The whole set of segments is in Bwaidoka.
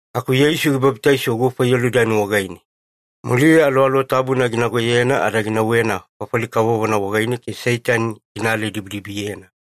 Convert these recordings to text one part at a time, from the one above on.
Aku Yeisu gibabitaiso gufa Yolidani wagaine, muliya Aluwaluwa Tabuna ginagoyena ada ginauwena fafali kavovona wagaine ke Seitani gina aladibidibiyena.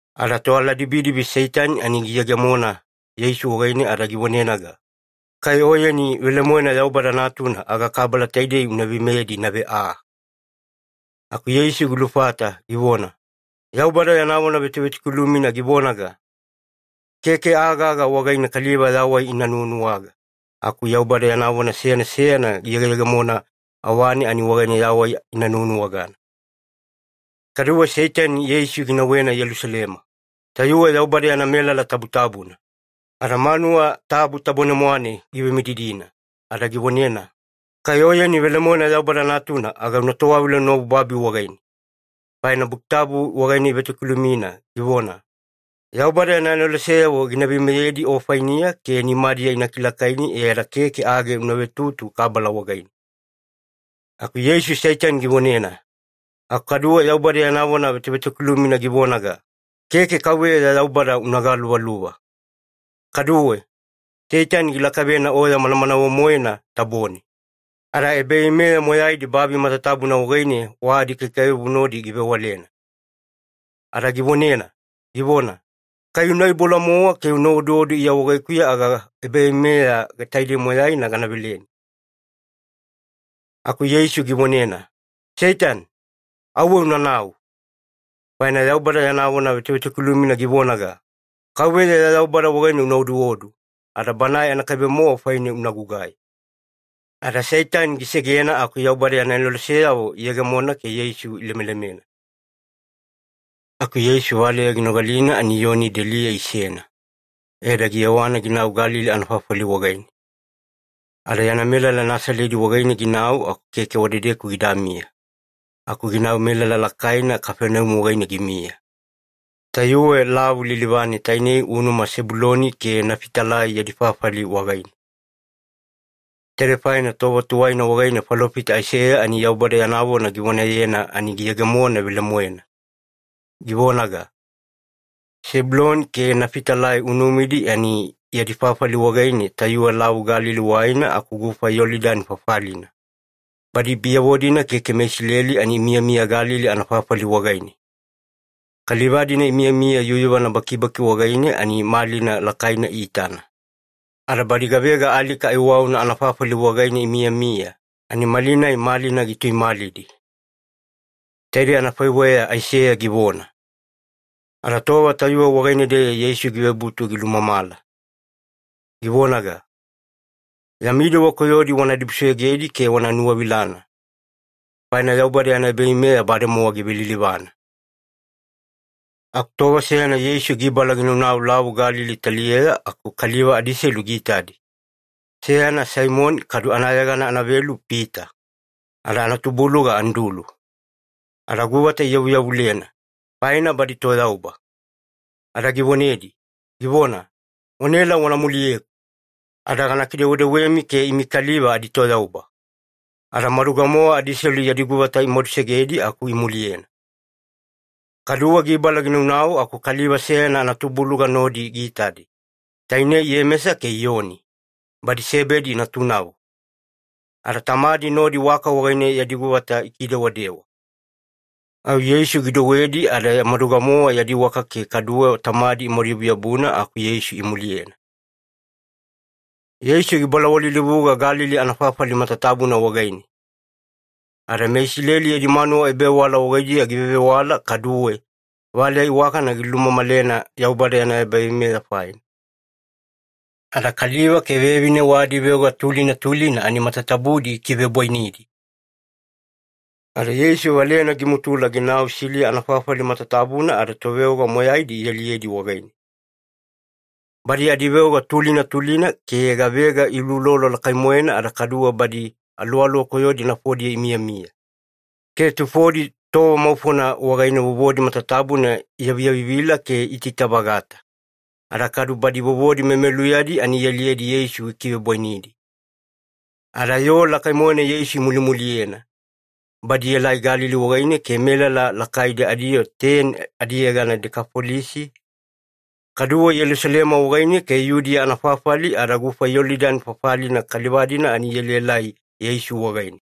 Ada toaladibidibi Seitani ani giyegemona Yeisu wagaine ada givonenaga, “Kai Oyeni velemoena Yaubada Natuna aga kabala taidei una veimeyedi inave aa.” Aku Yeisu gilufata givona, “Yaubada yana vona vetovetokilumina givonaga, ‘Keke aa gaga wagaine kaliva yawai ina nuwanuwaga, aku Yaubada yana vona seyana seyana giyegeyegemona awane, ani wagaine yawai ina nuwanuwagana.’” Kaduwe Seitani Yeisu ginauwena Yelusalema, tayuwe Yaubada yana melala tabutabuna, ada manuwa tabu tabone-mwane givemididina ada givonena, “Kai Oyeni velemoena Yaubada Natuna, aga una towavila unaobu babi wagaine, faina Buki Tabu wagaine ivetokilumina, givona, ‘Yaubada yana aneloseyavo gina veimeyedi o fainiya, ke nimadiya ina kilakaini e ada keke age una vetutu kabala wagaine.’” Aku Yeisu Seitani givonena, “Aku kaduwe Yaubada yana vona vetovetokilumina givonaga, ‘Keke KAUVEYA ya Yaubada una galuvaluva.’” Kaduwe, Seitani gilakavena oya manamanawe-moena tabone, ada ebaveimeya moyaidi babi matatabuna wagaine wa adikaikaiwabu nodi givewalena. Ada givonena, givona, “Kai una iboula-mowa ke una oduodu Iya wagaikuya, aga ebaveimeya taidei moyaina gana veleni.” Aku Yeisu givonena, “Seitani, auwe unanau! Faina Yaubada yana vona vetovetokilumina givonaga, ‘KAUVEYA ya Yaubada wagaine una oduodu, ada Banae anakaibe-mowa faine una gugai.’” Ada Seitani gisegena aku Yaubada yana aneloseyavo iyegemona ke Yeisu ilemelemena. Aku Yeisu valeya ginogalina ani Iyoni deliya isena, e ada giyewana ginau Galili anafafali wagaine. Ada yana melala Nasaledi wagaine ginau aku keke wadedeku gidamiya, aku ginau melala lakaina Kafaneumi wagaine gimiya. Tayuwe lavu lilivane tainei unuma Sebuloni ke Nafitalai yadi fafali wagaine. Taidei faina tova tuwaina wagaine falofita Aiseya ani Yaubada yana vona givonayena, ani giyegemona velemoena, givonaga, “Sebuloni ke Nafitalai unumidi ani yadi fafali wagaine tayuwe Lavu Galili waina aku gufa Yolidani fafalina, badi biyavo-dina keke meIsileli ani imiyamiya Galili anafafali wagaine, kaliva-dina imiyamiya yuyuvana bakibaki wagaine ani malina lakaina iitana. Ada badi gavega alika aiwauna anafafali wagaine imiyamiya, ani malinai malina gituimalidi.” Taidei anafaiweya Aiseya givona. Ada tova tayuwe wagaine-deya Yeisu givebutu gilulumamala, givonaga, “Yami dewa koyodi wana dibusoyogedi ke wana nuwavilana, faina Yaubada yana ebaveimeya bademowa givelilivana.” Aku tova seyana Yeisu gibala ginaunau Lavu Galili taliyeya aku kaliva adiselu giitadi, seyana Saimoni kadu anayegana anavelu Pita, ada anatubuluga Andulu. Ada guvata iyavuyavulena, faina badi toyauba. Ada givonedi, givona, “Wanaela wana muliyeku, ada gana kidewedewemi ke imi kaliva aditoyauba.” Ada maduga-mowa adiselu yadi guvata imadusegedi aku imuliyena. Kaduwe gibala ginaunau aku kaliva seyana anatubuluga nodi giitadi, tainei Iyemesa ke Iyoni, badi Sebedi natunavo. Ada tamadi nodi waka wagaine yadi guvata ikidewadewa. Au Yeisu gidouwedi ada maduga-mowa yadi waka ke kaduwe tamadi imaduyabuyabuna aku Yeisu imuliyena. Yeisu gibalawalilivuga Galili anafafali matatabuna wagaine, ada meIsileli yadi manuwa ebavewala wagaidiya givevewala kaduwe valeya iwakana gilumamalena Yaubada yana ebaveimeya faina. Ada kaliva ke vevine wa adiveoga tulina tulina ani matatabudi gikivebwainidi. Ada Yeisu valeyana gimutula ginau Siliya anafafali matatabuna ada toveoga moyaidi ialiyedi wagaine. Badi adiveoga tulina tulina ke gavega iuloulolo lakai-moena, ada kaduwe badi aluwaluwa koyodi nafodiya imiyamiya, ke tufodi tova maufona wagaine vovodi matatabuna iyaviyavivila ke iitaita-vagata, ada kadu badi vovodi memeluyadi ani ialiyedi Yeisu gikivebwainidi. Ada yoo lakai-moena Yeisu imulimuliyena. Badi ielai Galili wagaine ke melala lakaidi adiyoo teni adiyegana Dekafolisi, kaduwe Yelusalema wagaine ke Yudiya anafafali ada gufa Yolidani fafalina kaliva-dina ani ielaelai Yeisu wagaine.